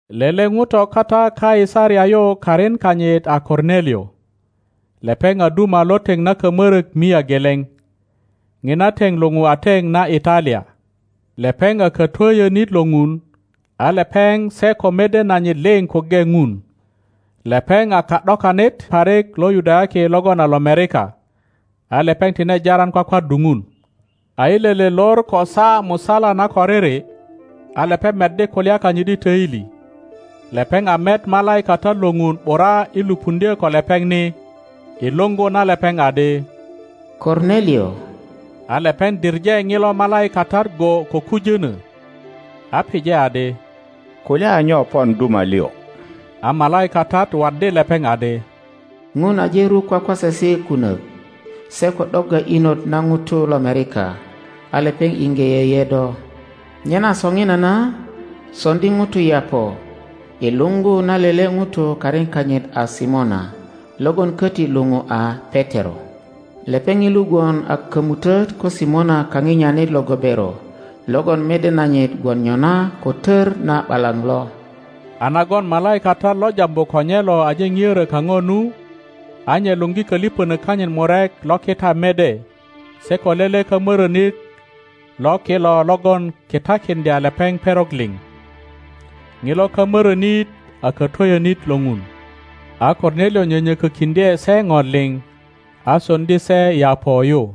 Lele ŋuto kata Kaisaria yu karin kanyit a Kornelio. Lepeŋ a duma lo teŋ na kamörök mia geleŋ. Ŋina teŋ luŋu a teŋ na Italia. Lepeŋ a katwöyönit lo Ŋun, a lepeŋ se ko mede nanyit liŋ kuŋge Ŋun. Lepeŋ a ka ’dokanit parik lo Yudayaki logon a lomerika, a lepeŋ tine jaran kwakwaddu Ŋun. A i lele lor ko saa musala na koriri, a lepeŋ meddi kulya kanyit i töili, lepeŋ a met malaikatat lo Ŋun ’bura i lupuŋdyö ko lepeŋ ni, i luŋgu na lepeŋ adi, Kornelio! A lepeŋ diŋe ŋilo malaikatat go ko kujönö, a pije adi, Kulya a nyo pon duma lio? A malaikatat waddi lepeŋ adi, Ŋun aje ruk kwakwasesi kunök se ko ’dogga inot na ŋutu lomerika, a lepeŋ iŋge yeye do. Nyena soŋinana soŋdi ŋutu Yaŋo i luŋgu na lele ŋuto karin kanyit a Simona, logon köti luŋu a Petero; lepeŋ ŋilu gwon a kömutöt ko Simona kaŋinyanit lo gobero logon mede nanyit gwon nyona ko tör na ’balaŋ lo. A nagon malaikatat lo jambu ko nye lo aje ŋiorö kaŋo nu, a nye luŋgi köliŋönök kanyit murek lo kita mede se ko lele kamörönit lo kilo logon kitakiŋdya lepeŋ perok liŋ. Ŋilo kamörönit a katwöyönit lo Ŋun. A Kornelio nyönyökökiŋdye se ŋo liŋ, a soŋdi se Yaŋo yu.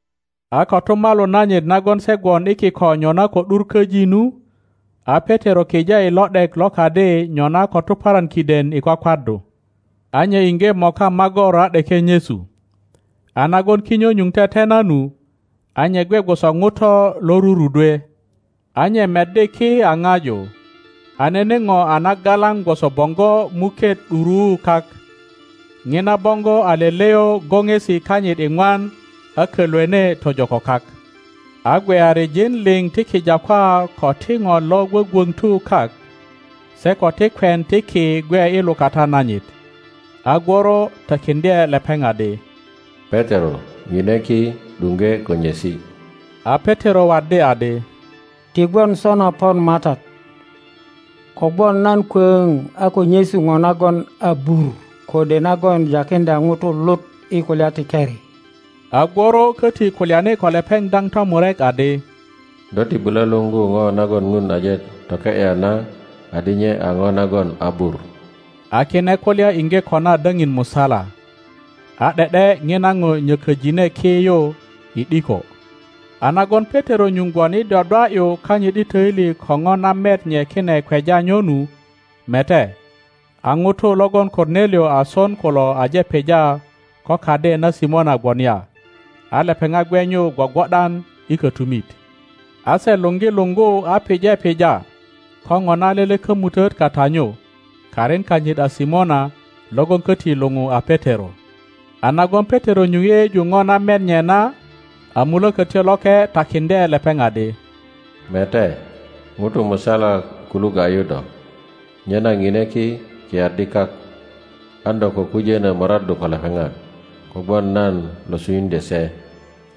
A kotumalu nanyit nagon se gwon i kiko nyona ko ’dur köji nu, a Petero kije i lo ’dek lo kadi nyona ko tuparan kiden i kwakwaddu. A nye iŋge moka magor a ’deke nyesu. A nagon kinyo nyuŋ tetena nu, a nye gwe gwoso ŋuto lo rurudwe, a nye meddi ki a ŋaju, a nene ŋo a nagalaŋ gwoso boŋgo muket ’duruu kak. Ŋina boŋgo a leleyo goŋesi kanyit iŋwan a kölwene tojo ko kak. a gweyarijin liŋ ti kijakwa ko ti ŋo lo gwögwöŋtu kak, se ko ti kwen ti ki gwe i lukata nanyit. A gworo takiŋdye lepeŋ adi, Petero, ŋine ki, ’duŋge ko nyesi. A Petero waddi adi, Ti gwon sona pon Matat; kogwon nan kwöŋ a ko nyesu ŋo nagon abur kode nagon jakiŋdya ŋutu lut i kulya ti keri. A gworo köti kulyani ko lepeŋ daŋ tomurek adi, Do ti bulo luŋgu ŋo nagon Ŋun aje toke ’ya na adi nye a ŋo nagon abur. A kine kulya iŋge kona daŋin musala. A ’de ’de ŋina ŋo nyököjine ki yu i ’diko. A nagon Petero nyuŋ gwon i dwadwa ’yu kanyit i töili ko ŋo na met nye kine kweja nyo nu, mete, a ŋutu logon Kornelio a son kulo aje pija ko kadi na Simona gwon ya, a lepeŋat gwe nyu gwogwo ’dan i kötumit. A se luŋgi luŋgu a pije pija ko ŋona lele kömutöt kata nyu, karin kanyit a Simona logon köti luŋu a Petero. A nagon Petero nyuŋ yeyeju po na met nye na, a Mulökötyo Loke takiŋdye lepeŋ adi, Mete, ŋutu musala kulu ga ’yu do. Nyena pine ki, kiyaddi kak. An do ko kujönö moraddu ko lepeŋat, kogwon nan lo sunyuŋdyö se.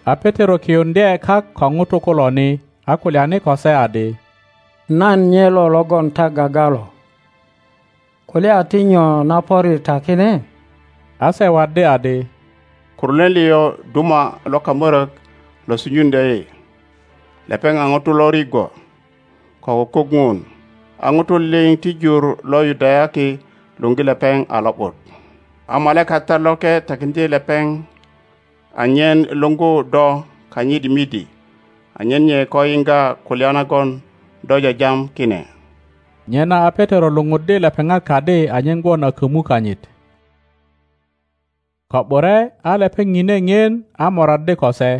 A Petero kiyuŋdye kak ko ŋutu kulo ni, a kulyani ko se adi, Nan nyelo logon ta gaga lo. Kulya a ti nyo na pöri ta kine? A se waddi adi, Kornelio duma lo kamörök lo sunyuŋdyö yi. Lepeŋ a ŋuto lo rigwo ko kukuk Ŋun. a ŋutu liŋ ti jur lo Yudayaki luŋgi lepeŋ a lo ’but. A malaikatat loke takiŋdye lepeŋ anyen luŋgu do kanyit midi anyen nye ko yiŋga kulya nagon do jajam kine. Nyena a Petero luŋuddi lepeŋat kadi anyen gwon a kömu kanyit. Ko ’bure a lepeŋ pine ŋien a moraddi ko se,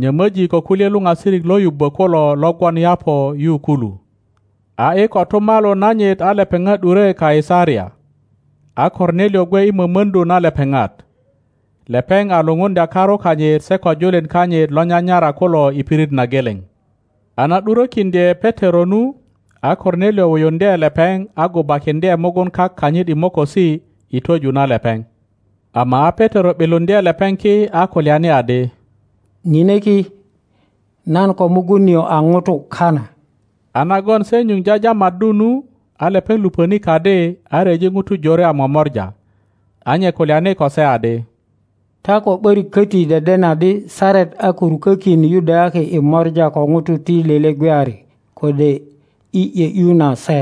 nyömöji ko kulye luŋasirik lo yubbö kulo lo gwon Yaŋo yu kulu. A i kotumalu nanyit a lepeŋat ’dure Kaisaria, a Kornelio gwe i mömöŋdu na lepeŋat. Lepeŋ a lupuŋdya karu kanyit se ko julin kanyit lo nyanyara kulo i pirit na geleŋ. a na ’durökiŋdye Petero nu, a Kornelio wuyuŋdye lepeŋ a gubakiŋdye mugun kak kanyit i mokosi i twöju na lepeŋ. Ama a Petero ’biluŋdye lepeŋ ki, a kulyani adi, Ŋine ki, nan ko mugun nio a ŋuto kana. a nagon se nyuŋ jajamaddu nu, a lepeŋ luŋöni kadi a ryeji ŋutu jore a momora. a nye kulyani ko se adi, Ta ko ’börik köti deden adi saret a ko rukökin Yudayaki i mora ko ŋutu ti lele gweyari kode i ’yö ’yu na se;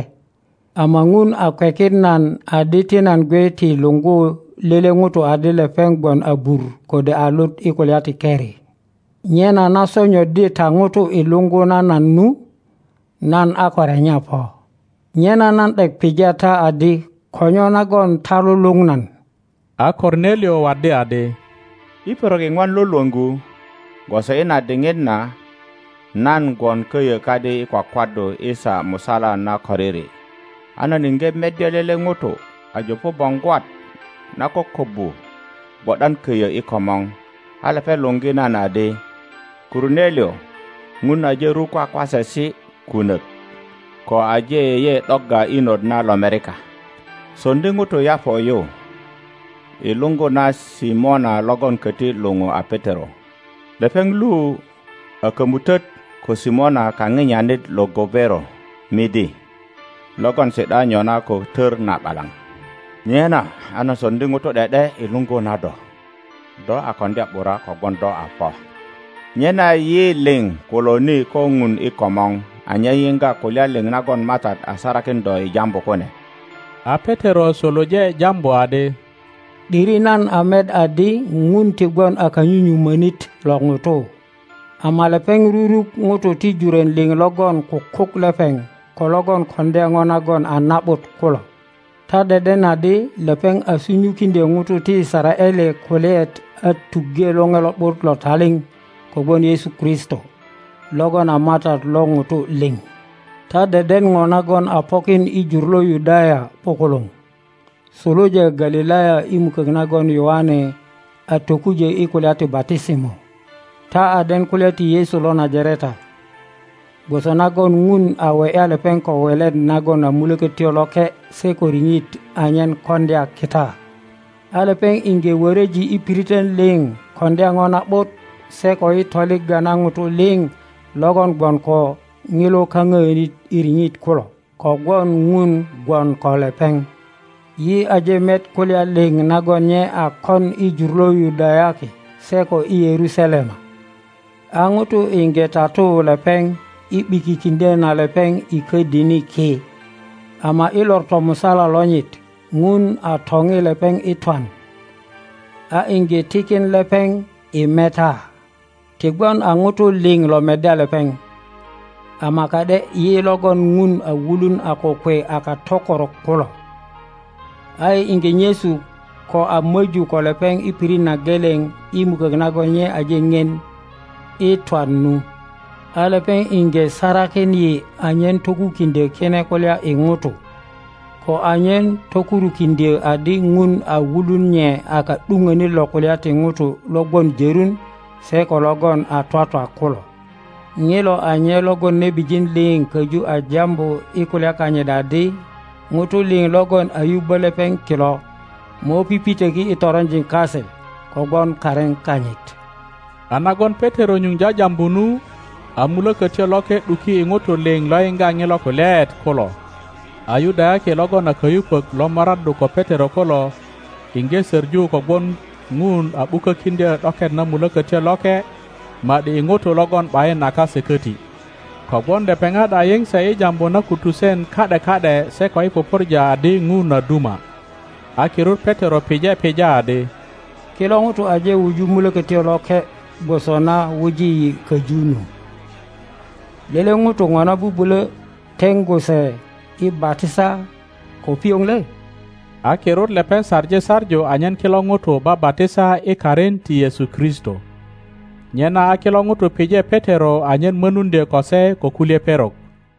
ama Ŋun a kwekin nan adi ti nan gwe ti luŋgu lele ŋuto adi lepeŋ gwon abur kode a lut i kulya ti keri. Nyena na sonyoddi ta ŋutu i luŋgu na nan nu, nan a ko renya po. Nyena nan ’dek pija ta adi ko nyo nagon ta luluŋ nan? A Kornelio waddi adi, I perok iŋwan lo lwöŋgu, gwoso i na diŋit na, nan gwon köyö kadi i kwakwaddu i saa musala na koriri, a nan iŋge meddya lele ŋuto a jupu boŋgwat na kokobbu gwo ’dan köyö i komor. A lepeŋ luŋgi nan adi, Kornelio, Ŋun aje ruk kwakwasesi kunök ko aje yeye ’dogga inot na lomerika. Soŋdi ŋutu Yaŋo yu i luŋgu na Simona logon köti luŋu a Petero.Lepeŋ lu a kömutöt ko Simona kaŋinyanit lo gobero midi, logon si ’da nyona ko tör na ’balaŋ. Nyena a nan soŋdi ŋutu ’de ’de i luŋgu na do. Do a koŋdya ’bura kogwon do a po. Nyena yi liŋ kulo ni ko Ŋun i komor anyen yiŋga kulya liŋ nagon Matat a sarakin do i jambu kune. A Petero suluje jambu adi, ’Diri nan a met adi Ŋun ti gwon a kanyunyumönit lo ŋutu; ama lepeŋ ruruk ŋutu ti jurön liŋ logon kukuk lepeŋ ko logon koŋdya po nagon a na ’but kulo. Ta deden adi lepeŋ a sunyukiŋdyö ŋutu ti Yisaraele kulyaet a tuŋge Loŋe Lo ’but lo taliŋ kogwon Yesu Kristo, logon a Matat lo ŋutu liŋ. Ta deden po nagon a pokin i jur lo Yudaya ’bukuluŋ, suluja Galilaya i mukök nagon Yoane a tokujö i kulya ti batisimo. Ta a den kulya ti Yesu lo Najareta, gwoso nagon Ŋun a we ’ya lepeŋ ko welet nagon a Mulökötyo Loke se ko riŋit anyen koŋdya kita. A lepeŋ iŋge wöröji i piritön liŋ koŋdya po na ’but se ko i toligga na ŋutu liŋ logon gwon ko ŋilo kaŋöönit i riŋit kulo; kogwon Ŋun gwon ko lepeŋ. Yi aje met kulya liŋ nagon nye a kon i jur lo Yudayaki se ko i Yerusalema. A ŋutu iŋge tatu lepeŋ i ’bikikindyö na lepeŋ i ködini ki. Ama i lor tomusala lonyit Ŋun a topi lepeŋ i twan, a iŋge tikin lepeŋ i meta. Ti gwon a ŋutu liŋ lo meddya lepeŋ, ama ka ’de yi logon Ŋun a wulun a kokwe a katökorok kulo. A yi iŋge nyesu ko a möju ko lepeŋ i pirit na geleŋ i mukök nagon nye aje ŋien i twan nu. a lepeŋ iŋge sarakin yi anyen tokukiŋdyö kine kulya i ŋutu, ko anyen tokurukiŋdyö adi Ŋun a wulun nye a ka ’dupönit lo kulya ti ŋutu lo gwon jörun se ko logon a twatwa kulo. Ŋilo a nye logon nebijin liŋ köju a jambu i kulya kanyit adi ŋutu liŋ logon a yubbö lepeŋ kilo mo pipitöki i toronjin kase kogwon karin kanyit. A nagon Petero nyuŋ jajambu nu, a Mulökötyo Loke ’duki i ŋutu liŋ lo yiŋga ŋilo kulyaet kulo. a Yudayaki logon a kayupök lo moraddu ko Petero kulo iŋge söŋu kogwon Ŋun a ’bukö kiŋdyo ’doket na Mulokotyo Loke ma ’di i ŋutu logon ’bayin a kase köti. Kogwon lepeŋat a yiŋ se i jambu na kutusen ka ’de ka ’de se ko i pupurja adi Ŋun a duma. A kirut Petero pije pija adi, Kilo ŋutu aje wuju Mulokötyo Loke gwoso na wuji yi köju nu. Lele ŋuto ŋona bubulo teŋgu se i batisa ko pioŋ le? a kirut lepeŋ saŋi saŋu anyen kilo ŋutu babatisa i karin ti Yesu Kristo. Nyena a kilo ŋutu pije Petero anyen monuŋdyö ko se ko kulye perok.